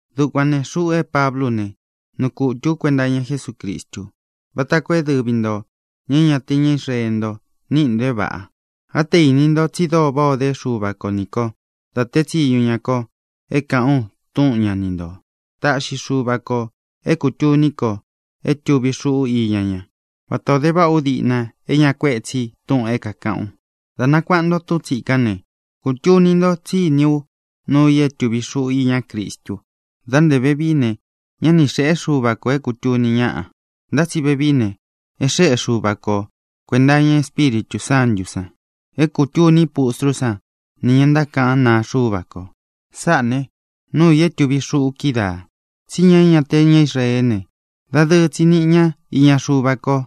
Dukuān ne, xuꞌu é Pablú u ne, nuu kutū ú kuenta iña Jesúcristu, váta koo é dɨvi ntō, ña é ña te ña Israeé nto, níꞌi ntō é vāꞌa. Á te īni nto tsi dóo váꞌā o dé Xuva ko ni kō da tée tsiñu ña ko é kāꞌán u túꞌun ña ni ntō. Táꞌxi Xuva kō é kūtuni ko é tuvi xuꞌu íña ña, vatā o dé váꞌa ú diꞌna é ña kuéꞌe tsi túꞌūn é kākaꞌán u. Dā nakuaꞌa nto túꞌun tsīkán ne, kūtuni nto tsí iní u nuu i é tuvi xuꞌu iñá Cristu. Dá ntē vevií ne, ñá ni xēꞌé Xuva kō é kūtuni ñáꞌa. Ntá tsi vevií ne, e xéꞌe Xuva ko kuēnta iña Espíritū Sántū san é kūtuní pustrú san nī ña ntákaꞌán naa Xuva ko. Sáꞌā ne, nuu i é tuvi xuꞌu kídaā: tsí ña é ña te ña Israeé ne, dadɨɨ tsi niꞌi ña íña Xuva ko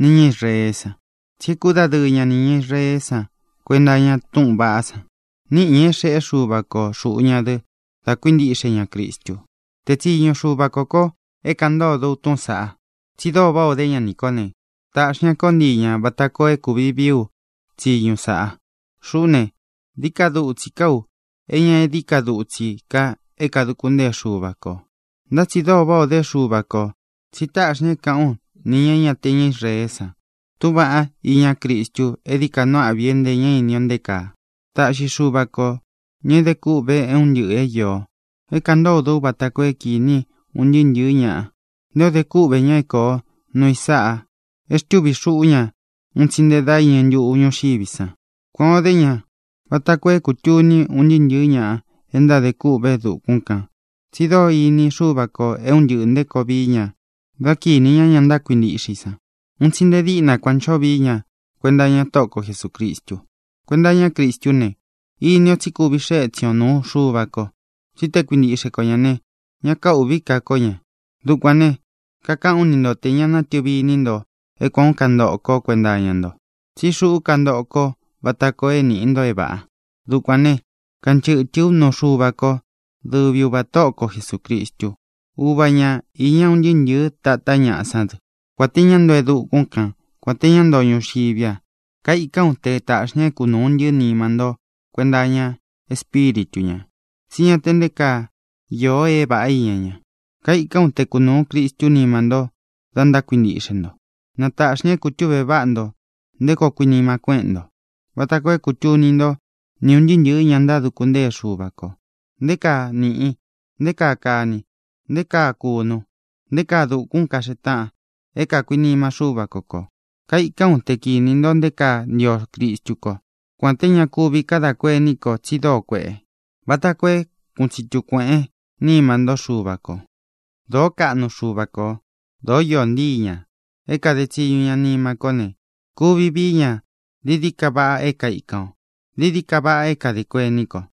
nī ña Israeé san, tsi e kúdadɨɨ ña nī ña Israeé san kuenta iña túꞌūn vaꞌá san. Níꞌi ñā é xēꞌé Xuva ko xūꞌu ña dɨ dá kuintīꞌxe ña Cristu. Tēé tsiñu Xuva kō ko é kāꞌan ntódo u túꞌūn saꞌa, tsi dóo váꞌā ó de ña nī kó ne, tāꞌxi ña kó ntii ñā vata koo é kūvi vií u tsiñu sāꞌa. Xuꞌú ne, dií ka dutsi kaa u é ña e dií ka dutsi kaa é kāduku ntée Xuva kō. Ntá tsi dóo váꞌā o dé Xuva kō, tsi táꞌxi ñā é kāꞌán u nī ña é ña te ña Israeé san túꞌūn vaꞌá iñá Cristu é dií ka nuu áꞌvi é ntē ña ini o nté kaa. Taꞌxi Xuva kō, ña é de kûꞌve é un ntɨꞌɨ̄ é īo, é kāꞌan ntódo ú vata koo é kīni un ntɨɨ́ ntɨ̄ɨ́ ñaꞌa nté ō de kúꞌvē ña é koo nuu i sáꞌā e xtúvi xuꞌu ña un tsi nte dá iñɨ ntuꞌu ñūxiví san. Kuān o dé ña vata koo é kūtuni un ntɨɨ́ ntɨ̄ɨ́ ña e ntádē kûꞌve e dukún kan tsi dóo ini Xúva kō é un ntɨꞌɨ̄ nté koo vii ña dá kinī ñá ña ntákuintiꞌxe i san. Un tsi nte díꞌna kuān ó ncho vií ña kuenta iña Tóꞌo ko Jesūcristu. Kuenta iñá Cristú ne, ini o tsí kuvi xee étsin ō nuu Xuva ko. Tsí te kuintiꞌxe ko ñā ne, ñá kaūꞌví ka ko ñā. Dukuān ne, kakaꞌán u ni nto tē ña nátɨvi iní nto é kuān ó kantoꞌo kó kuenta iña nto. Tsí xuꞌú kantoꞌo kó vata koo é nīꞌi nto é vāꞌa. Dukuān né, kanchɨtɨ̄ ú nuu Xuva ko, dɨvi Uvā Tóꞌo ko Jesūcristu. Uva ña īña un ntɨɨ́ ntɨ̄ɨ́ tātá ñaꞌa sán dɨ, kuān té ña ntoo e dukún kan, kuān té ña ntoo ñuxiví a. Kaikán u te tāꞌxi ña é kunūu ntii nima ntó kuenta iña Espíritu ñā, tsí ña te nté kaa īo é vāꞌá iña ña. Kaikán u te kunūu Cristu nima ntó da ntákuintiꞌxe nto. Na tāꞌxi ña é kūtúꞌve váꞌa nto nté koo kuinima kuéꞌen nto, vata koo é kūtuni ntó, ni ūn ntɨɨ́ ntɨ̄ɨ́ ña ntáduku ntée Xuva kō, nté kaa nīꞌi, nté kaa kani, nté kaa kūnu, nté kaa dūkun kaxee táꞌan é kākuinima Xúva ko kō. Kaikán u te kinī nto nté kaa ntio Cristu kó, kuān té ña kuvi kadá kuení kō tsi dóo kuēꞌe, vata koo é kūꞌun tsitu kueꞌén nima ntó Xuva kō. Dōó kaꞌnu Xuva kō. Dōó īó ntii ña é kāde tsiñu ña nima kó ne, kuvi víi ña dií dií ka vaꞌa é kaikan o, dií dií ka vaꞌa é kadā kuení kō.